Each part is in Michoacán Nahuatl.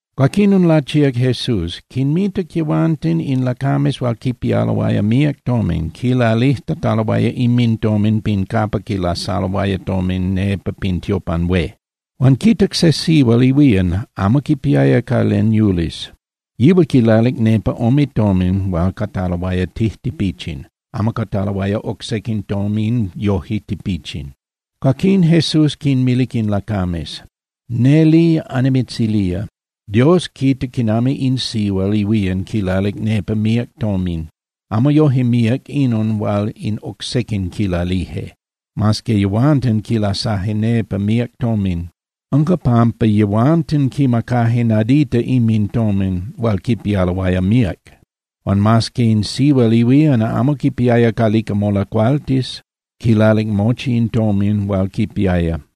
Cuaquinon lachíac Jesús, quinmitac yehuanten in lacames hual quipialoaya míac tomin quilalijtataloaya inmintomin pin capa quilasaloaya tomin nepa pin tiopan hué. Huan quitac se sihual ihuían amo quipiaya ca len yulis. Yihual quilalic nepa ome tomin hual cataloaya tijtipichin, amo cataloaya oc sequin tomin yoje tipichin. Cuaquín Jesús quinmilic in lacames: —Neli annimitzilía, Dios quita quinami in sihual ihuían quilalic nepa míac tomin. Amo yoje míac inon hual in oc sequin quilalije, mas que yehuanten quilasaje nepa míac tomin. Unca pampa yehuanten quimacaje nadita inmintomin hual quipialoaya míac. Huan mas que in sihual ihuían amo quipiaya calica molacualtis, quilalic mochi in tomin hual quipiaya.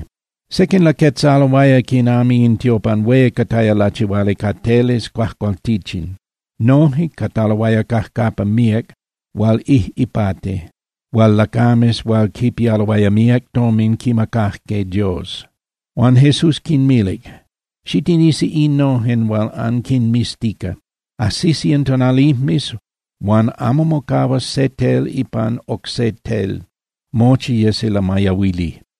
Sequin laquetzaloaya quinami in tiopan hué cataya lachihuali ca teles cuajcualtichin, noje cataloaya cajcapa míac hual ijꞌipati hual lacames hual quipialoaya míac tomin quimacajque Dios. Huan Jesús quinmilic: —Xitinisi innojen hual anquinmiztica. Ajsisi in tonalijmes huan amo mocahuas se tel ipan oc se tel, mochi yesi lamayahuili.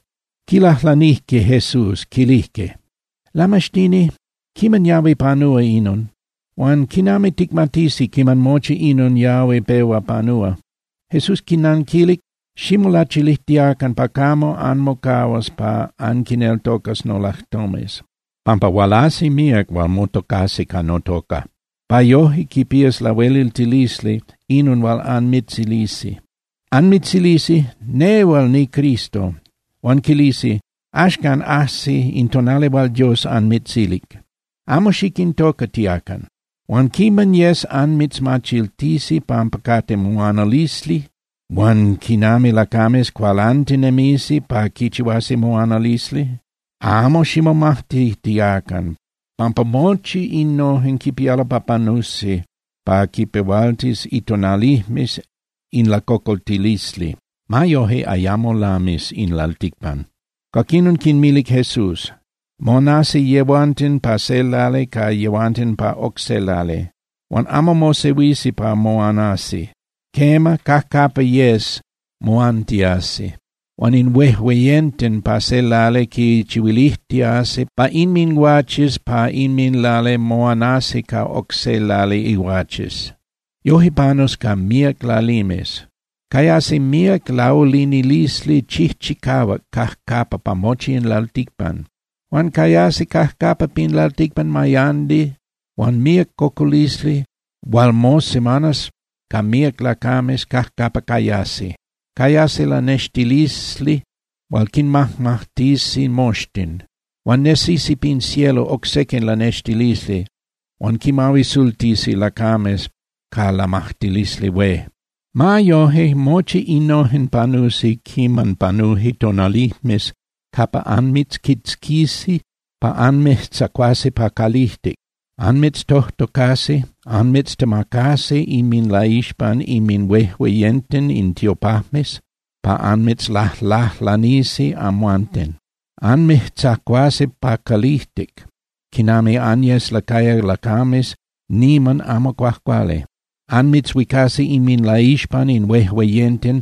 Quilajlanijque Jesús, quilijque: —Lamaxtini, ¿quiman yahui panúa inon? Huan ¿quinami ticmatisi quiman mochi inon yahui pehua panúa? Jesús quinanquilic: —Ximolachilijtiacan pa camo anmocahuas pa anquineltocas nolajtomes, pampa hualasi míac hual motocasi ca notoca pa yoje quipías lahueliltilisli inon hual anmitzilisi. Anmitzilisi: “Nehual niCristo.” Huan quilisi: “Axcan ajsic in tonali hual Dios anmitzilic.” Amo xiquintocatiacan. Huan quiman yes anmitzmachiltisi pampa cate moanalisli huan quinami lacames cualantinemisi pa quichihuasi moanalisli, amo ximomajtitiacan pampa mochi innojen quipialo pa panusi pa quinpehualtis itonalijmes in lacocoltilisli. Ma yoje, ayamo lamis in lalticpan. Cuaquinon quinmilic Jesús: —Moanasi yehuanten pa se lali ca yehuanten pa oc se lali, huan amo mosehuisi pa moanasi. Quema, cajcapa yes moantiasi, huan in huejueyenten pa se lali quichihuilijtiasi pa inminguaches pa inminlali moanasi ca oc se lali iguaches. Yoje panus ca míac lalimes. Cayasi míac laulinilisli chijchicahuac cajcapa pa mochi in lalticpan. Huan cayasi cajcapa pin lalticpan mayandi huan míac cocolisli hual mosemanas ca míac lacames cajcapa cayasi. Cayasi lanextilisli hual quinmajmajtisi moxtin. Huan nesisi pin cielo oc sequin lanextilisli hual quinmahuisultisi lacames ca lamajtilisli hué. ’Ma yoje, mochi innojen panusi quiman panuje tonalijmes capa anmitzquitzquisi pa anmijtzacuasi pa calijtic. Anmitztojtocasi, anmitztemacasi inminlaixpan inminhuejueyenten in tiopajmes pa anmitzlajlajlanisi amhuanten. Anmijtzacuasi pa calijtic quinami anyesquiaya lacames niman amo cuajcuali. Anmitzhuicasi inminlaixpan in huejueyenten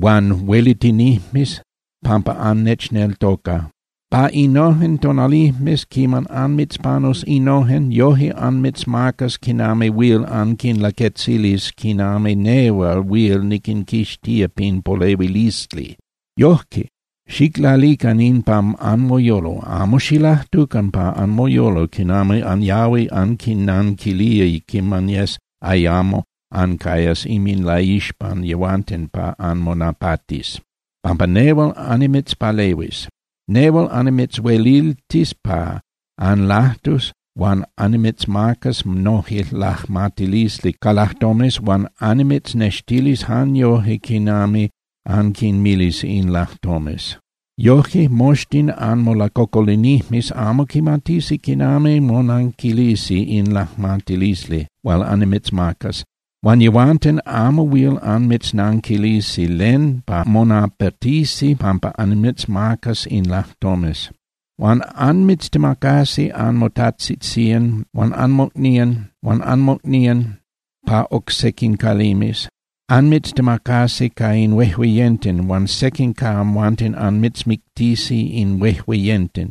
huan huelitinijmes pampa annechneltoca. Pa innojen tonalijmes quiman anmitzpanus innojen, yoje anmitzmacas quinami huil anquinlaquetzilis quinami nehual huil niquinquixtía pin polehuilisli. Yoje, xiclalican in pa anmoyolo: Amo xilajtucan pa anmoyolo quinami anyahui anquinnanquilía quiman yes ayamo ancayas inminlaixpan yehuanten pa anmonapatis, pampa nehual annimitzpalehuis. Nehual annimitzhueliltis pa anlajtus huan annimitzmacas noje lajmatilisli ca lajtomes huan annimitznextilis jan yoje quinami anquinmilis in lajtomes. Yoje moxtin anmolacocolinijmes amo quimatisi quinami monanquilisi in lajmatilisli hual annimitzmacas, huan yehuanten amo huil anmitznanquilisi len pa monapatisi pampa annimitzmacas in lajtomes. Huan anmitztemacasi anmotajtzitzían huan anmocnían huan anmocnían pa oc sequin calimes, anmitztemacasi ca in huejueyenten huan sequin ca amhuanten anmitzmictisi in huejueyenten.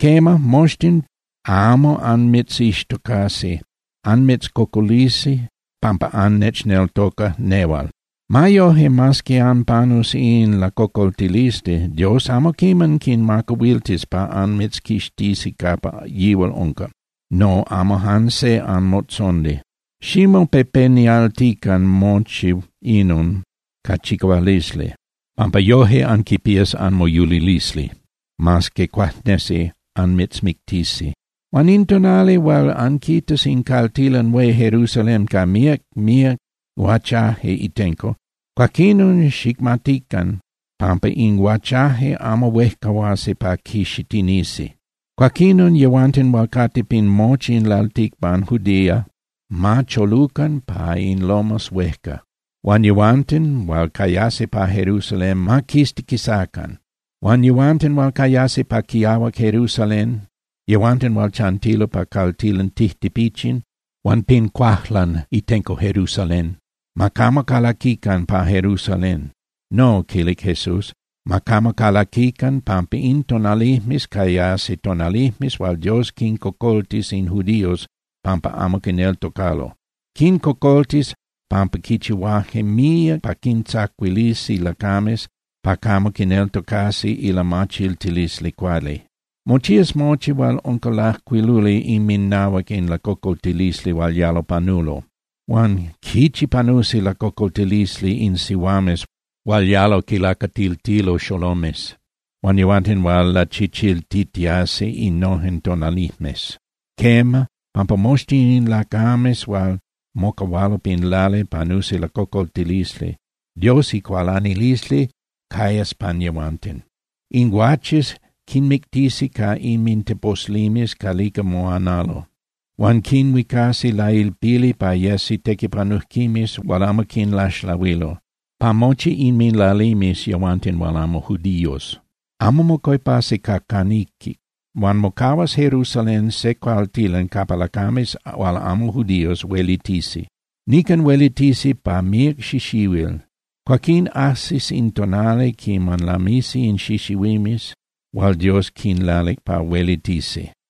Quema, moxtin amo anmitzixtocasi, anmitzcocolisi pampa annechneltoca nehual. Ma yoje, mas que anpanus in lacocoltilisli, Dios amo quiman quinmacahuiltis pa anmitzquixtisi capa yihual unca, no, amo jan se anmotzondi. Ximopepenialtican mochi inon ca chicahualisli, pampa yoje anquipías anmoyulilisli, mas que cuajnesi anmitzmictisi. ’Huan in tonali hual anquitas in caltilan hué Jerusalén ca míac míac guachaje itenco, cuaquinon xicmatican pampa in guachaje amo huejcahuasi pa quixitinisi. Cuaquinon yehuanten hual cate pin mochi in lalticpan Judea ma cholucan pa in lomas huejca. Huan yehuanten hual cayasi pa Jerusalén ma quistiquisacan. Huan yehuanten hual cayasi pa quiahuac Jerusalén, yehuanten hual chantilo pa caltilan tijtipichin huan pin cuajlan itenco Jerusalén, ma camo calaquican pa Jerusalén. No —quilic Jesús—, ma camo calaquican, pampa in tonalijmes cayasi tonalijmes hual Dios quincocoltis in judíos pampa amo quineltocalo. Quincocoltis pampa quichihuaje míac pa quintzacuilisi lacames pa camo quineltocasi ilamachiltilisli cuali. Mochías mochi hual unca lajcuiluli inminahuac in lacocoltilisli hual yalo panulo. Huan ¡quichi panusi lacocoltilisli in sihuames hual yalo quilacatiltilo xolomes, huan yehuanten hual lachichiltitiasi innojen tonalijmes! Quema, pampa moxtin in lacames hual mocahualo pin lali panusi lacocoltilisli. Dios icualanilisli cayas pan yehuanten. In guaches quinmictisi ca inminteposlimes calica moanalo, huan quinhuicasi lailpili pa yesi tequipanujquimes hual amo quinlaxlahuilo pa mochi inminlalimes yehuanten hual amo judíos, amo mocuepasi ca caniquic. Huan mocahuas Jerusalén se caltilan capa lacames hual amo judíos huelitisi. Nican huelitisi pa míac xixihuil. Cuaquín ajsis in tonali quiman lamisi in xixihuimes hual Dios quinlalic pa huelitisi.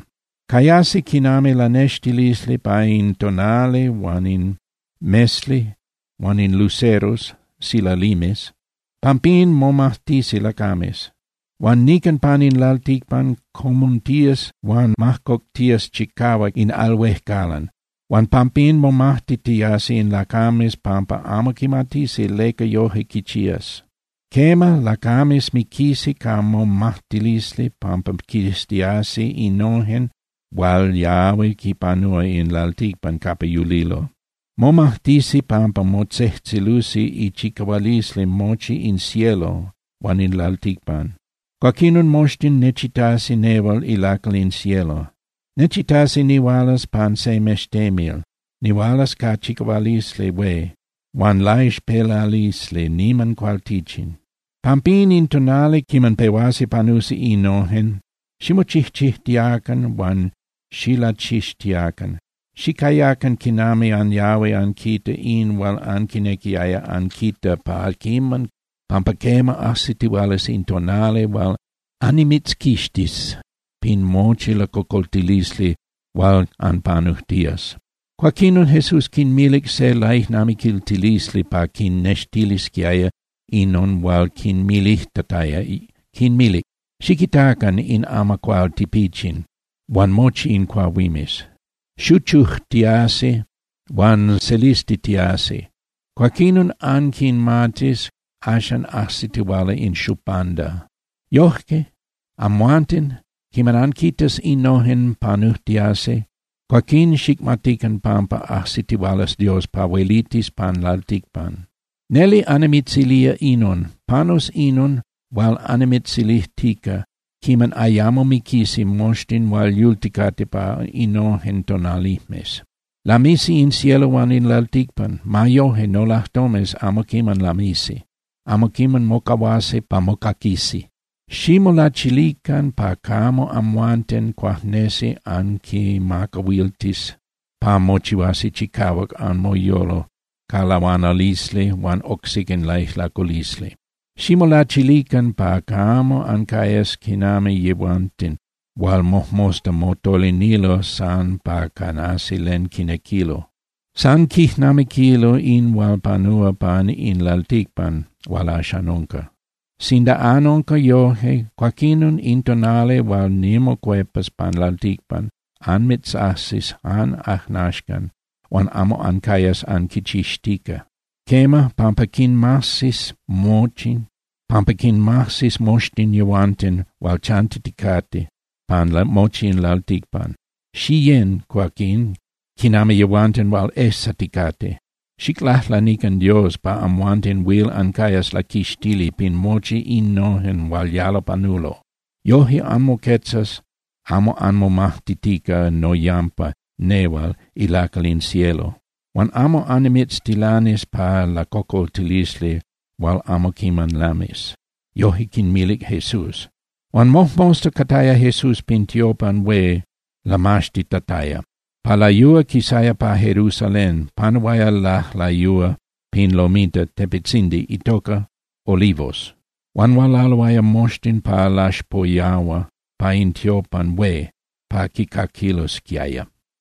’Cayasi quinami lanextilisli pa in tonali huan in mesli huan in luceros (silalimes), pampín momajtisi lacames. Huan nican pan in lalticpan comuntías huan majcoctías chicahuac in al huejcalan, huan pampín momajtitiasi in lacames pampa amo quimatisi leca yoje quichías. Quema, lacames miquisi ca momajtilisli pampa quiztiasi innojen hual yahui quipanúa in lalticpan capa yulilo. Momajtisi pampa motzejtzelusi ichicahualisli mochi in cielo huan in lalticpan. Cuaquinon, moxtin nechitasi nehual ilacal in cielo. Nechitasi nihualas pan se mextemil, nihualas ca chicahualisli hué huan laixpelalisli niman cualtichin. Pampín, in tonali quiman pehuasi panusi innojen, ximochijchijtiacan huan xilachixtiacan. Xicayacan quinami anyahui anquita in hual anquinequiaya anquita pa quiman, pampa quema, ajsitihualas in tonali hual annimitzquixtis pin mochi lacocoltilisli hual anpanujtías. Cuaquinon Jesús quinmilic se laijnamiquiltilisli pa quinnextilisquiaya inon hual quinmilijtataya, quinmilic: —Xiquitacan in amacuál tipichin huan mochi in cuahuimes. Xuchujtiasi huan selistitiasi, cuaquinon anquimatis axan ajsitihuala in xupanda. Yoje, amhuanten, quiman anquitas innojen panujtiasi, cuaquín xicmatican pampa ajsitihualas Dios pa huelitis pan lalticpan. ’Neli annimitzilía inon: Panus inon hual annimitzilijtica quiman ayamo miquisi moxtin hual yulticate pa innojen tonalijmes. Lamisi in cielo huan in lalticpan. Ma yoje, nolajtomes amo quiman lamisi, amo quiman mocahuasi pa mocaquisi. ’Ximolachilican pa camo amhuanten cuajnesi anquimacahuiltis pa mochihuasi chicahuac anmoyolo ca lahuanalisli huan oc sequin laijlaculisli. Ximolachilican pa camo ancayas quinami yehuanten hual mojmosta motolinilo san pa canasi len quinequilo. San quijnamiquilo in hual panúa pan in lalticpan hual axan unca. Sinda anunca yoje, cuaquinon in tonali hual nimocuepas pan lalticpan anmitzajsis jan ajnaxcan huan amo ancayas anquichixtica. Quema, pampa quinmajsis moxtin yehuanten hual chantiticate pan mochi in lalticpan. Xiyén, cuaquín, quinami yehuanten hual ejsaticate, xiclajlanican Dios pa amhuanten huil ancayas laquixtili pin mochi innojen hual yalo panulo. Yoje anmoquetzas amo anmomajtitica noyampa nehual ilacal in cielo, huan amo annimitztilanis pa lacocoltilisli hual amo quiman lamis. Yoje quinmilic Jesús. Huan mojmosta cataya Jesús pin tiopan hué lamaxtitataya. Pa layúa quisaya pa Jerusalén, panuaya lajlayúa pin lomita (tepetzindi) itoca Olivos. Huan hualaloaya moxtin pa laxpoyahua pa in tiopan hué pa quicaquilosquiaya.